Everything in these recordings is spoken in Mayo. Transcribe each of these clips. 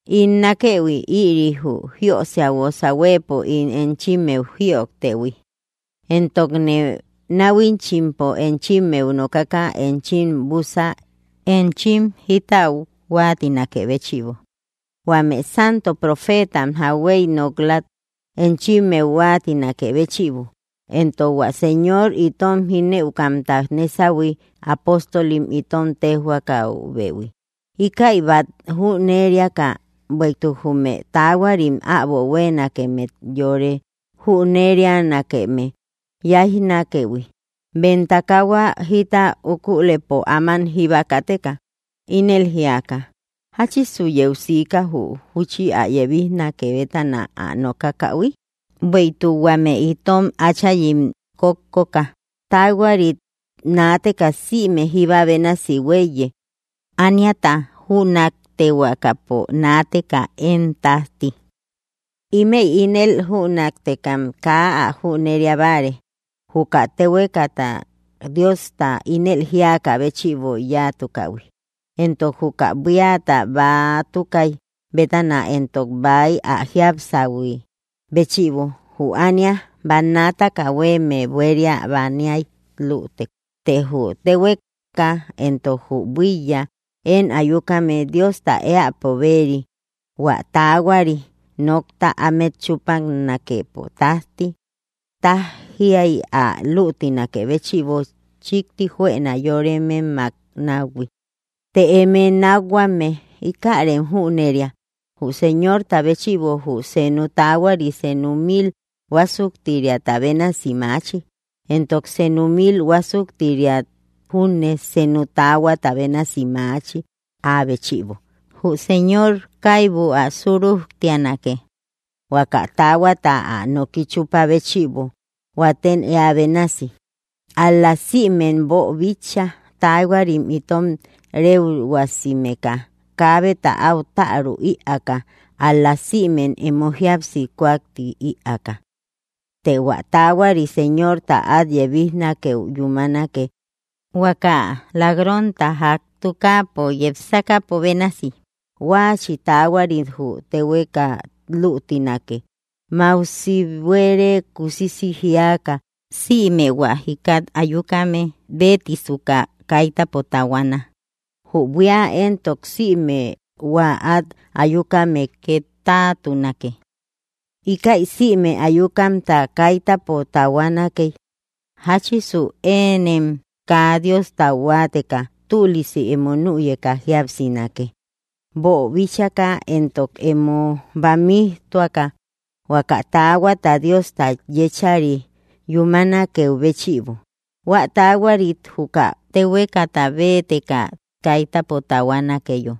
In nákëhui, ïri jü jíösia guosa huëpo ín enchimmeu jïojtëhui, éntokne náhuichimpo enchimmeu nokaka enchim bússa enchim jítäu huáatinakë béchïbo, huame santo profeetam jauhuey nok‑läu enchimmeu huáatinakë béchïbo, éntok hua Señor itom jínëukamta nésahui apóstolim itom téjhuakaubehui. Íkäi bát jüneriaka, bueïtuk jume taahuarim äbo huéenakemmet yore junnerianakeme yáijnakëhui, bem takahua jita ukulëpo áman jíba kateka, ínel jíaka: “¿Jáchisu yeu siika jü júchi ä yebijnake bétana ä nokakähui? Bueïtuk huame itom áchayim kókkoka taahuarit naateka sïme jíba bénasi huéiye, ániata jünaktehuakapo naateka én tájti.” Ímëi ínel jünaktekam kaa ä jüneria báare, juka téhuekata Diosta ínel jíakä béchïbo yáatukähui, éntok juka buíata bäatukaï bétana éntok bäy ä jiapsähui. Huä béchïbo, jü ánia bannaataka huéeme buéria baniay lütek. Të jü téhueka éntok jü buíya én ayukame Diosta éäpo bëri hua taahuari nokta ámet chúpanakepo tájti, tájiay ä luutinakë béchïbo, chíkti juëna yórememmak náuhui. Të eme nákhuame, íkärem jüneria: jü Señorta béchïbo jü senu taahuari senu mil huásuktiriata bénasi maachi, éntok senu mil huásuktiria júne senu taahuata bénasi maachi áa béchïbo. Jü Señor kaibu ä surujtianake, huaka taahuata ä noki chúpa béchïbo huatem éä bénasi, ál‑la sïmem boobíchaïhui, taahuarim itom réuhuasimeka, kaabeta áu tärü ïaaka ál‑la sïmem emo jíapsi kúaktï ïaaka. Të hua taahuari Señorta át yebijnakeu yúmanake huaka lak‑ronta ják tukaapo yepsakäpo bénasi; huaachi taahuarit jü téhueka luutinake mausi buére kusisi jíaka, sïme hua jikat ayukame béetisuka kaitäpo tahuana, jü buía entok sïme hua át ayukame két táatunake. Íkäi sïme ayukamta kaitäpo tahuanakey, jáchisu ënem kaa Diostau huáateka tülisi emo nüyeka jíapsinake, boobíchaka éntok emo bamijtuaka huaka taahuata Diosta yéchari yúmanakeu béchïbo, hua taahuarit juka téhuekata béeteka kaitäpo tahuanakeyo,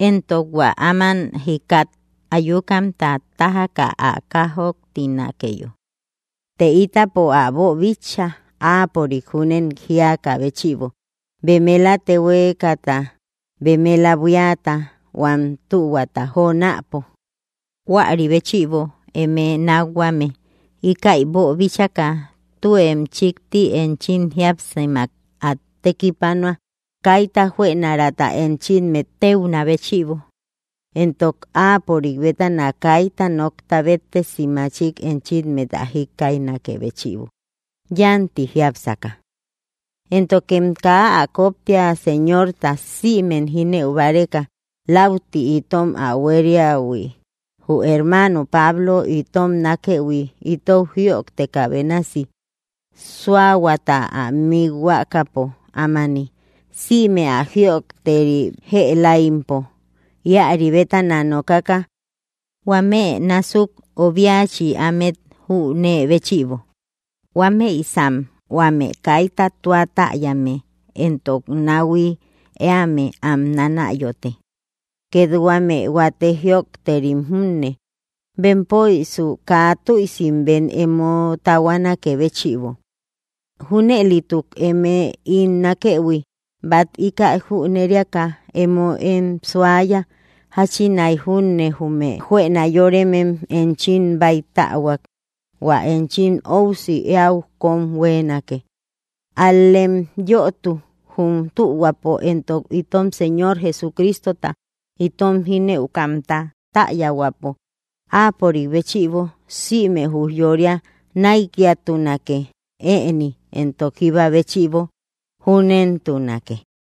éntok hua áman jikkat ayukamta tájaka ä kájoktinakeyo. Të ítapo ä boobíchaïhui áapörik júnen jíakä béchïbo bemela téhuekata, bemela buíata, huam tühuata jonäpo. Huäri béchïbo, eme nákhuame, íkäi boobíchaka tuem chíkti enchim jíapsimak át tekipanua kaita juënarata enchimmet téunä béchïbo, éntok áapörik bétana kaita nokta béttesi machik enchimmet ä jíkkaijnakë béchïbo, yánti jiápsaka. Éntokem kaa ä koptia, Señorta sïmem jínëu báreka lauti itom ä huériähui; jü hermano Pablo itom nákëhui itou jïojtekä bénasi, súahuata ä mikhuakapo ámani, sïme ä jïojteri jëlaimpo íäri bétana nokaka; huame násuk obiachi ámet jünee béchïbo, huámëisan huame kaita tua täyame éntok náuhui éame am nánayote, két huame huate jïojterim junne, bempöisu kaa tüisi bem emo tahuanaké béchïbo. Júnëlituk eme, ín nákëhui, bát íkäi jüneriaka, emoem suaya, jáchinai júne jume juëna yóremem enchim báitähuak hua enchim óusi eäu kóm huéenake. Al‑lem yötu jum tühuapo éntok itom Señor Jesucristota, itom jínëukamta, täyahuäpo. Áapörik béchïbo sïme ujyória näikiatunake, ëni éntok jíba béchïbo. Júnentunake.